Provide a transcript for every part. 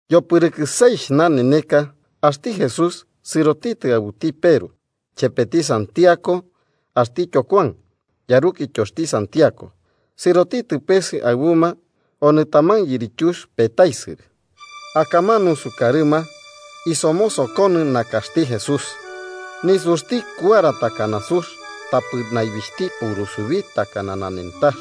Yopɨrɨkɨ seixh naneneka, axti Jesús sɨrotitɨ aɨbuti Peru chepeti Santiago axtityo Kuan, yarukityoxti Santiago sɨrotitɨ peese aɨbuma onɨ taman yirityux petaisɨrɨ. Akamanu, sukarɨma, somoso nakaxti Jesús. Nisuxti kuara takana sux, tapɨ naibixhti purusubi takana nanentax.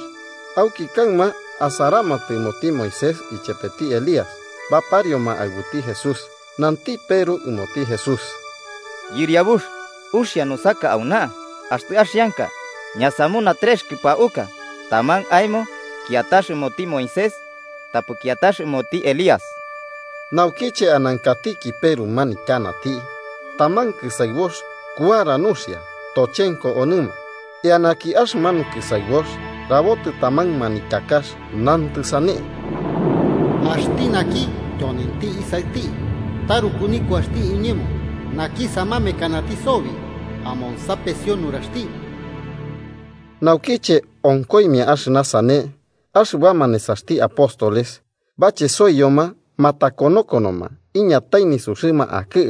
Auki kaɨma asaramatɨ ɨmoti Moisés ichepeti Elías baparioma aɨbuti Jesús. Nanti Peru ɨmoti Jesús: –Yɨriabux, ¡uxia nusaka auna! Axtɨ axianka, ñasamuna trex kɨpauka: taman aemo, kiatax ɨmoti Moisés tapɨ kiatax ɨmoti Elías. Naukiche anankatiki Peru manityanati, taman kɨsaɨbox kuara nuxia tochenko onɨma, eanaki axɨmanu kɨsaɨbox rabotɨ taman manityakax, nantɨ sane: “Axti naki tyonenti Isaɨti taruku nikuaxti iñemo, naki samamamekanati sobi: amonsapesio nuraxti.” Naukiche onkoimia axɨna sane, axɨbama nesaxti apóstoles bachesoiyoma matakonokonoma iñatai nisuxɨma akɨ,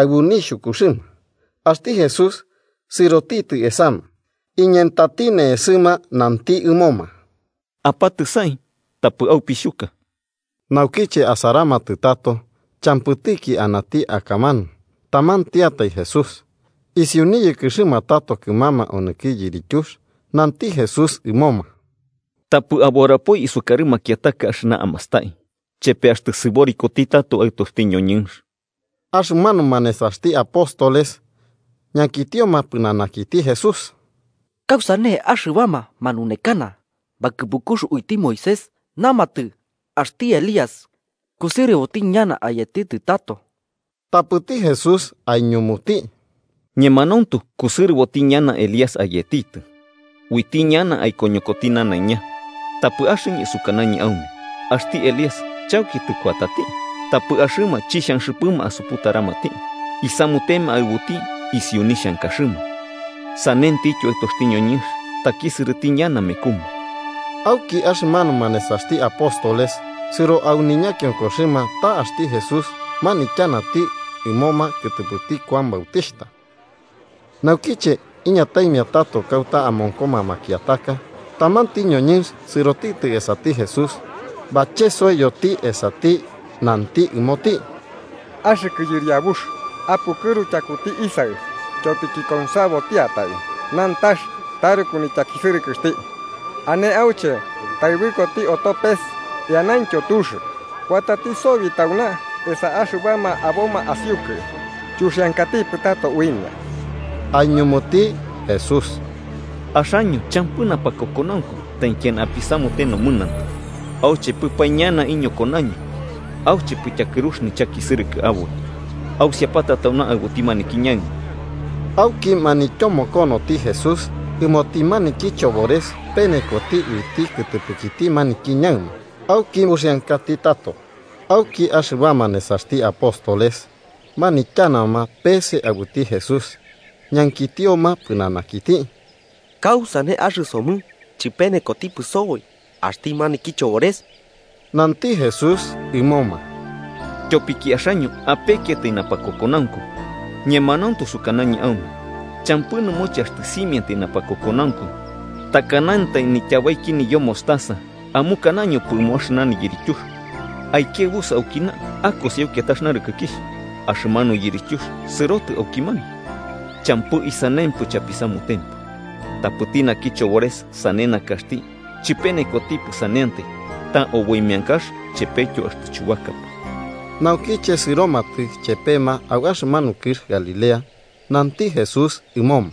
aɨbu nixhukuxɨma. Axti Jesús sɨrotitɨ esama, iñentati ne'esɨma nanti ɨmoma: –Apatɨsai. Tapɨ aupixhuka. Naukiche asaramatɨ tato, champɨtiki anati akamanu, tamantiatai Jesús. Isiu niyɨkɨxɨma tato kɨmama onɨki yirityux, nanti Jesús ɨmoma: –Tapɨ aburapoi isukarɨ makiataka axɨna amastai, chepe axtɨ sɨborikoti tato Aɨtoxti ñoñɨnx. Axɨmanuma nesaxti apóstoles ñankitioma pɨnanakiti Jesús: –¿Kausane axɨbama manunekana bakɨpukux uiti Moisés namatɨ axti Elías kusɨrɨboti ñana ayetitɨ tato? Tapɨti Jesús aiñumuti: –Ñemanauntu kusɨrɨboti ñana Elías ayetitɨ, uiti ñana aikoñokoti nanaiña. Tapɨ axɨñɨ sukanañɨ aume axti Elías chauki tɨkuatati, tapɨ axɨma chixhanxɨpɨma asuputaramati, isamutema aɨbuti isiu nixhankaxɨma. Sanentityo Aɨtoxti ñoñɨnx takisɨrɨti ñana mekuma. Auki axɨmanuma nesaxti apóstoles sɨro au ñakionkoxɨma ta axti Jesús manityanati ɨmoma kɨtɨpɨti Kuan Bautixhta. Naukiche iñataimia tato kauta amonkoma makiataka, tamanti ñoñɨnx sɨrotitɨ esati Jesús, bachesoiyoti esati nanti ɨmoti: 15–Axɨkɨ Yɨriabux, apukɨru tyakuti isaɨ, tyopiki konsabotiatai nantax taruku nityakisɨrɨkɨxti. Ane auche taɨbɨkoti oto pes eanaintyo tux. Kuatati sobi tauna esa axɨbama aboma asiukɨ, chuxiankatipɨ tato uimia. Aiñumuti Jesús: –¡Axaño champɨ napakokonaunku taikiana apisamute nomɨnantɨ! ¿Auchepɨpae ñana iñokonaño auchepɨ tyakɨrux nichakisɨrɨkɨ aboi? Ausiapata tauna aɨbuti maniki ñaɨma. Auki manityomokonoti Jesús ɨmoti maniki chobores penekoti uiti kɨtɨpɨkiti maniki ñaɨma, auki uxiankati tato. Auki axɨbama nesaxti apóstoles manityanama peese aɨbuti Jesús, ñankitioma pɨnanakiti: –¿Kausane axɨsomɨ chɨpenekotipɨ soboi axti maniki chobores? Nanti Jesús ɨmoma: –Tyopiki axaño apekiatai napakokonaunku. Ñemanauntu sukanañɨ aume, champɨ nɨmoche axtɨ simiantai napakokonaunku, takanantai nityabaiki niyo mostaza, amukanañopɨ ɨmo axɨna yirityux: “Aikiaɨbusɨ aukina akosi au kiatax narɨkɨkixh”, axɨmanu yirityux sɨrotɨ aukimanu. Champɨ isanempɨ chapisamutempɨ. Tapɨti naki chobores sane nakaxti chɨpenekotipɨ saneantai ta oboi meankax chepetyo axtɨ chubakapɨ. Naukiche sɨromatɨ chepema au axɨmanu kɨx Galilea, nanti Jesús ɨmoma: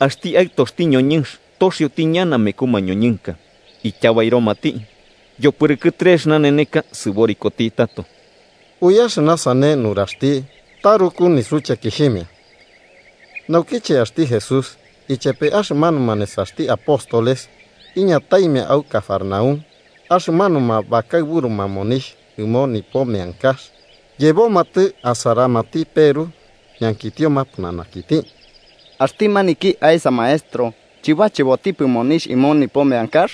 –Axti Aɨtoxti ñoñɨnx toxioti ñana meku mañoñɨnka, ityabairomati. Yopɨrɨkɨ trex naneneka sɨborikoti tato. Ui axɨna sane nuraxti taruku nisuchekixhimia. Naukiche axti Jesús ichepe axɨmanuma nesaxti apóstoles iñataimia au Cafarnaúm, axɨmanuma bakaɨburuma monixh ɨmo nipo meankax yebomatɨ asaramati Peru, ñankitioma pɨnanakiti: –¿Axti maniki aesa maestro chɨbachebotipɨ monixh ɨmo nipo meankax?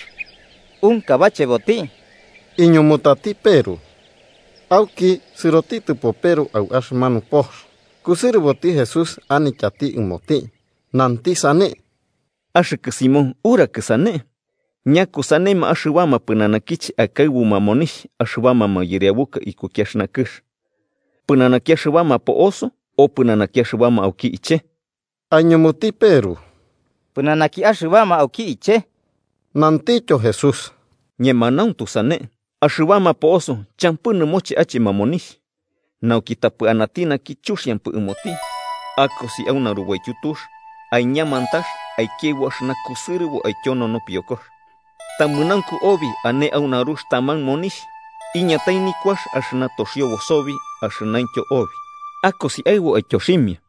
25–Unka bacheboti, –iñumutati Peru. Auki, sɨrotitɨpo Peru au axɨmanu pox, kusɨrɨboti Jesús anityati ɨmoti, nanti sane: –¿Axɨkɨ Simón, urakɨ sane? ¿Ñakusanema axɨbama pɨnanakiche akaɨbuma monixh axɨbama mayɨriabuka ikuki axɨna kɨx: pɨnanaki axɨbama po'oso o pɨnanaki axɨbama auki iche? Aiñumuti Peru: –Pɨnanaki axɨbama auki iche. Nantityo Jesús: –Ñemanauntu sane, axɨbama po'oso champɨ nɨmoche achema monixh. Nauki, tapɨ anati naki chuxiampɨ ɨmoti, akosi au narubaityu tux, aiña mantax aikiaɨbu axɨna kusɨrɨbo aityono nopiokox. Tamɨnaunku obi ane au narux taman monixh, iñatai nikuax axɨna toxiobo sobi axɨnaintyo obi. Akosi aɨbu aityoximia.